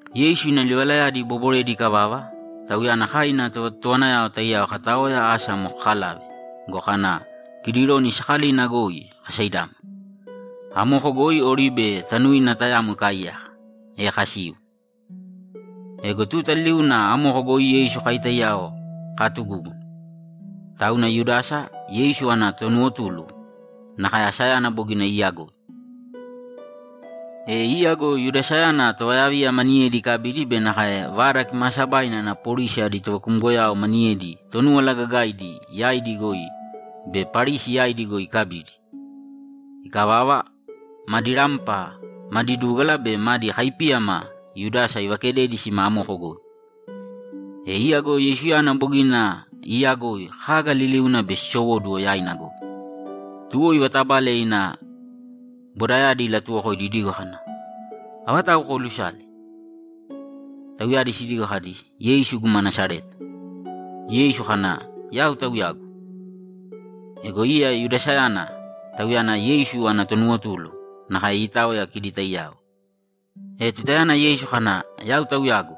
Yeisu ina livalayadi iboboredi ikavava, Tauyana kai ina tovatotowanayao taiyao kataoya asa amo kakalave go, kana Kidironi sakalina goi kasaidámana. Amoko goi oribe tanuina tayamo ikaaiyaka, e kasiu. Ego tuta liliuna amoko goi Yeisu kai taiyao kaatugúguna. Tauna Yudasa, Yeisu ana tonuwotulu, nakae asayana bogina iiyagoi. E iya go Yudasayana tovayaviya maniyedi ikabidi be nakae Vada Kimaasabaina ana polisi adi tovakumgoyao maniyedi Tonúwala Gagaidi yaidi goi be Parisi yaidi goi ikabidi. Ikavava, madi rampa, madi dúgala be madi kaipíyama Yudasa ivakededi sima amoko goi. E iya go Yeisuyana bogina iiyagoi kaga liliuna bei sisowóduwo yaina goi. Tuwo ivatabale ina bodayadi ilatuwokoidi idigo kana, ‘Avatau koolusale?’ Tauyadi sidigo kadi, ‘Yeisu guma Nasareta.’ Yeisu kana, ‘Yau Tauyagu.’ Ego iya Yudasayana, tauyana Yeisu ana tonuwotulu, nakae iitaoya kidi taiyao. E tutayana Yeisu kana, ‘Yau Tauyagu’,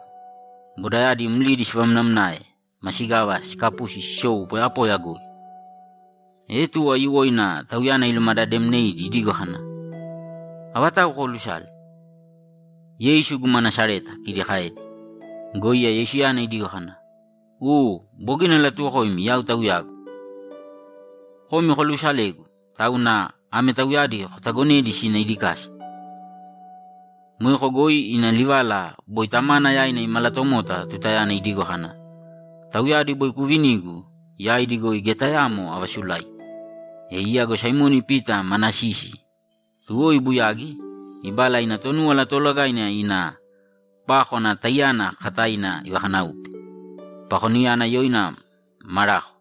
bodayadi mlidi sivamnamnae masigava sikapusi sisou poyapoya goi. E tuwo aiyuwoina Tauyana ilumadademneidi idigo kana, ‘Avatau koolusale?’ ‘Yeisu guma Nasareta’, kidi kaedi. Go iya Yeisuyana idigo kana, ‘U, bogina alatuwokoimi Yau Tauyagu. Komi koluusalegu, tauna ame tauyadi kotagonēdi sina idi kasa.’ Moeko goi ina livala boi Tamana yaina imalatomota tutayana idigo kana, ‘Tauyadi boi kuuvinigu, yaidi goi geya tayamo avasulaigi.’ E iya go Saimoni Pita mana sisi, tuwo ibuyagi, ibala ina Tonúwala Toolagaina ina pákwana taiyana kakataina ivakanáupe. Pakoninayana yoina Malako.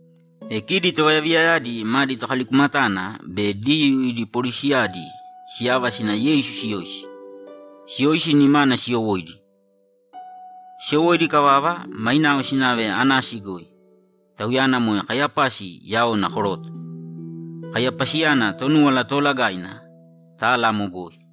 E kidi tovayaviyayadi madi tokalikumatana be Diyuu idi polisiyadi siyava sina Yeisu siyoisi. Siyoisi, nimana siyowóidi. Siyowóidi ikavava, mainao sinave Anasi goi. Tauyana moe Kaiyapasi yaona koroto. Kaiyapasiyana Tonúwala Toolagaina tala amo goi.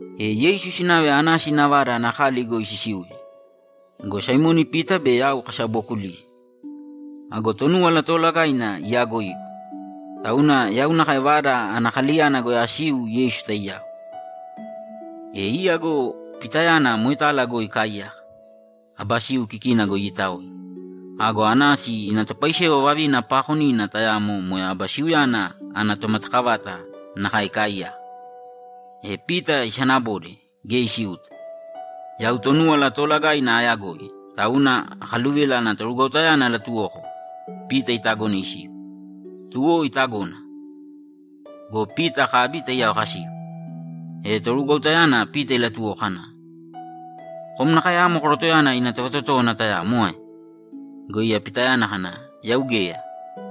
E Yeisu sinave Anasi ina vada ana kali goi sisiuye go, Saimoni Pita be yau kasabookuliye. Ago Tonúwala Toolagaina iyaagoigu, tauna yau nakae vada ana kaliyana goi asiu Yeisu taiyao. E iya go Pitayana moetala goi ikaaiyaka, aba siu kikina goi iitaoya. Go Anasi ina topaisewa vavina paakonina tayamo moe aba siuyana ana tomatakavata nakae ikaaiyaka, e Pita isanabode geya isiuta. Yau Tonúwala Toolagaina aayagoi, tauna akaluvila ana torugwautayana alatuwoko Pita itagone isiu. Tuwo itagona go, Pita akabi taiyao kasiu. E torugwautayana Pita ilatuwoko kana, ‘Kom nakae amo korotoyana ina tovatotówana tayamo ae?’ Go iya Pitayana kana, ‘Yau geya.’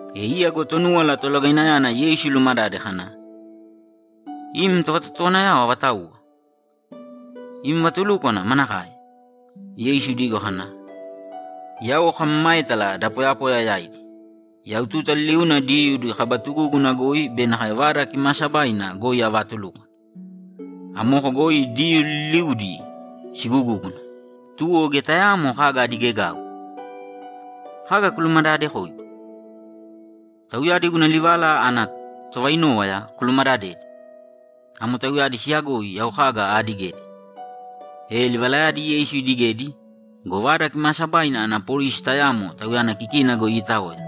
E iya go Tonúwala Tolagainayana Yeisu ilumadade kana, ‘Im tovatotowanayao avatauwa? Im vatulúkwana manakae?’ Yeisu idigo kana, ‘Yau akamamaétala da poyapoya yaidi. Yau tuta liliuna Diyuu ida kaba tugúguna goi be nakae Vada Kimaasabaina goi avaatulúkwana. Amoko goi Diyuu liliudi sigugúguna. Tuwo geya tayaamo kaga adigegau. Kaga kulumadadekoigu? Tauyadi guna livala ana tovainówaya kulumadadēdi. Amo tauyadi siyagoi yau kaga aadigedi.’ E livalayadi Yeisu idigedi go, Vada Kimaasabaina ana polisi tayamo Tauyana kikina goi iitaoya,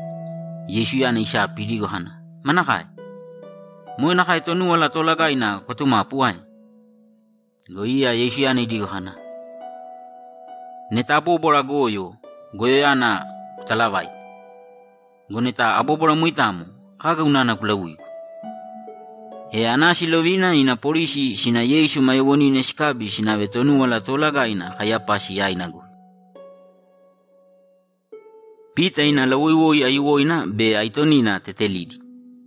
Yeisuyana isapi idigo kana, ‘Manakae? Moe nakae Tonúwala Toolagaina kwatumapu ae?’ Go iya Yeisuyana idigo kana, ‘Neta abobwara goyo, goyoyana kutalavāite. Go neta abóbwara moitamo, kaga unana kulauigu?’ E Anasi ilovina ina polisi sina Yeisu ma yoowonina sikabi sinave Tonúwala Toolagaina Kaiyapasi yaina goi. Pita ina lawoiwoi aiyuwoina be aitonina tetelidi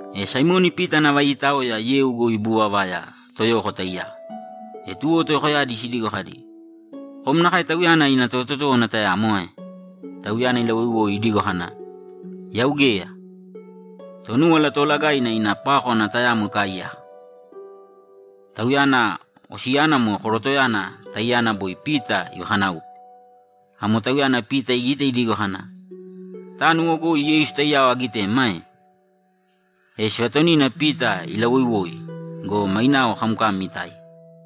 E Saimoni Pita nava iitaoya yeu goi ibuuvavaya toyoko taiyao. E tuwo toyokoyadi sidigo kadi, ‘Kom nakae Tauyana ina tovatotówana tayamo ae?’ Tauyana ilawoiwoi idigo kana, ‘Yau geya!’ Tonúwala Toolagaina ina pákwana tayamo ikaaiyaka; tauyana osiyana moe korotoyana taiyana boi Pita ivakanáupe. Amo tauyana Pita igite idigo kana, ‘Tánuwo goi Yeisu taiyao agitemi ae?’ E sivatonina Pita ilawoiwoi go, mainao kamkam itáiya.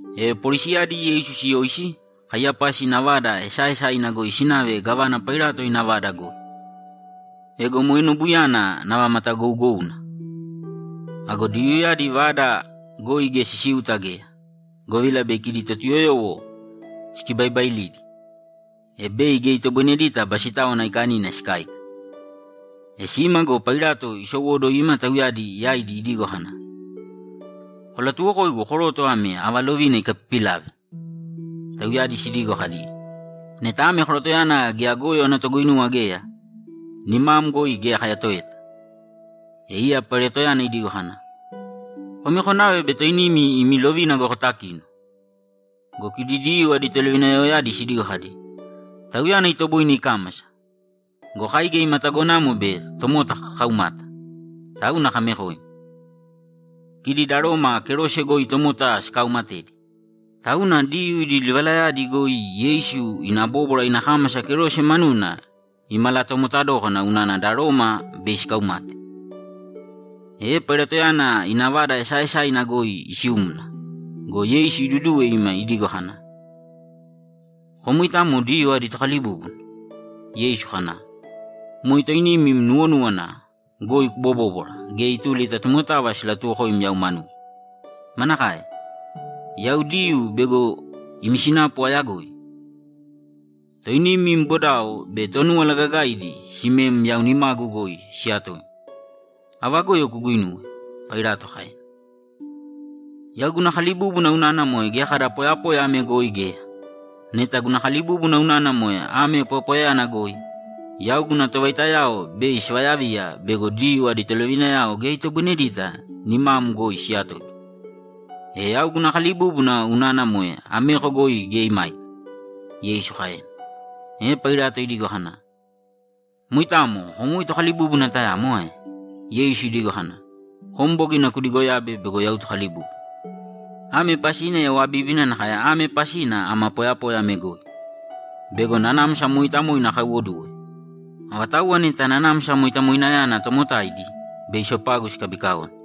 E polisiyadi Yeisu siyoisi, Kaiyapasi ina vada esaaesaina goi sinave gávana Pailato ina vada goi. Ego moe nobuyana nava matagougouna. Ago Diyuuyadi vada goi geya sisiuta geya, govila bei kidi Totuyoyowo sikibaibailidi, e bei geya itoboinedita Basitáwana Aikanina sikáika. E sima go, Pailato isowóduwo ima tauyadi yaidi idigo kana, ‘Kolatuwokōigu koroto ame ava lovina ikapipilave?’ Tauyadi sidigo kadi, ‘Neta ame korotoyana geya goyo ana toguinuwa geya, nimam goi geya kayatoeta.’ E iya Pailatoyana idigo kana, ‘Komi konāve bei toinimi imi lovina goi kotakīno!’ Go kidi Diyuu adi tolovinayaoyadi sidigo kadi, ‘Tauyana itoboine ikámasa go, kai geya ima tagonamo bei tomota kakaumata, tauna kamekoim.’ Kidi da Roma kerose goi tomota sikauumatedi. Tauna Diyuu idi livalayadi goi Yeisu ina bóbwara ina kámasa kerose manuna imalatomota dókana unana da Roma bei sikaumate. E Pailatoyana ina vada esaaesaina goi isiumna go, Yeisu iduduwe ima idigo kana, ‘Kom moitamo Diyuu adi Tokalibúbuna?’ Yeisu kana, ‘Moe toinim im nuwonúwana goi kubobóbwara gea ituli ta tomotava silatuwokoim yau manugu?’ ‘Manakae? Yau Diyuu bego imi sinapu ayagoi? Toinim im bodao be Tonúwala Gagaidi simem yau nimagu goi siyatoim. Ava goyo kuguinuwe?’ Pailato kaena. ‘Yau guna kalibúbuna unana moe geya kada poyapoya ame goi geya. Neta guna kalibúbuna unana moe ame poyapoyayana goi, yau guna tovaitayao bei sivayaviya bego Diyuu adi tolovinayao geya itoboinedita nimam goi siyatoigu. E yau guna kalibúbuna unana moe ameko goi geya imaita’, Yeisu kaena. E Pailato idigo kana, ‘Moitamo kom woi Tokalibúbuna tayamo ae?’ Yeisu idigo kana, ‘Kom bogina kudigoyabe bego yau Tokalibúbuna. Ame pasina yau abíbina nakae ame pasina ama poyapoya ame goi: Bego Nanamsa Mooitamoina akaiwoduwe. Avatauwa neta Nanamsa Moitamoinayana tomotaidi, bei sopagu sikabikaone.’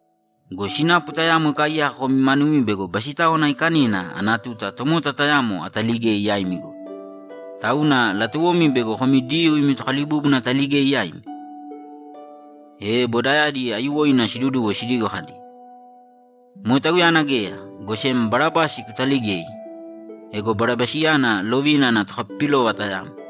Go sinapu tayamo ikaaiyaka komi manumi bego Basitáwana Aikanina ana tuta tomota tayamo ataligei yaimi goi. Tauna latuwomi bego komi Diyuu imi Tokalibúbuna ataligei yaimi?’ E bodayadi aiyuwoina siduduwo sidigo kadi, ‘Moe Tauyana geya! Go sem Barabasi kutaligēi!’ Ego Barabasiyana lovina ana tokapipilova tayamo.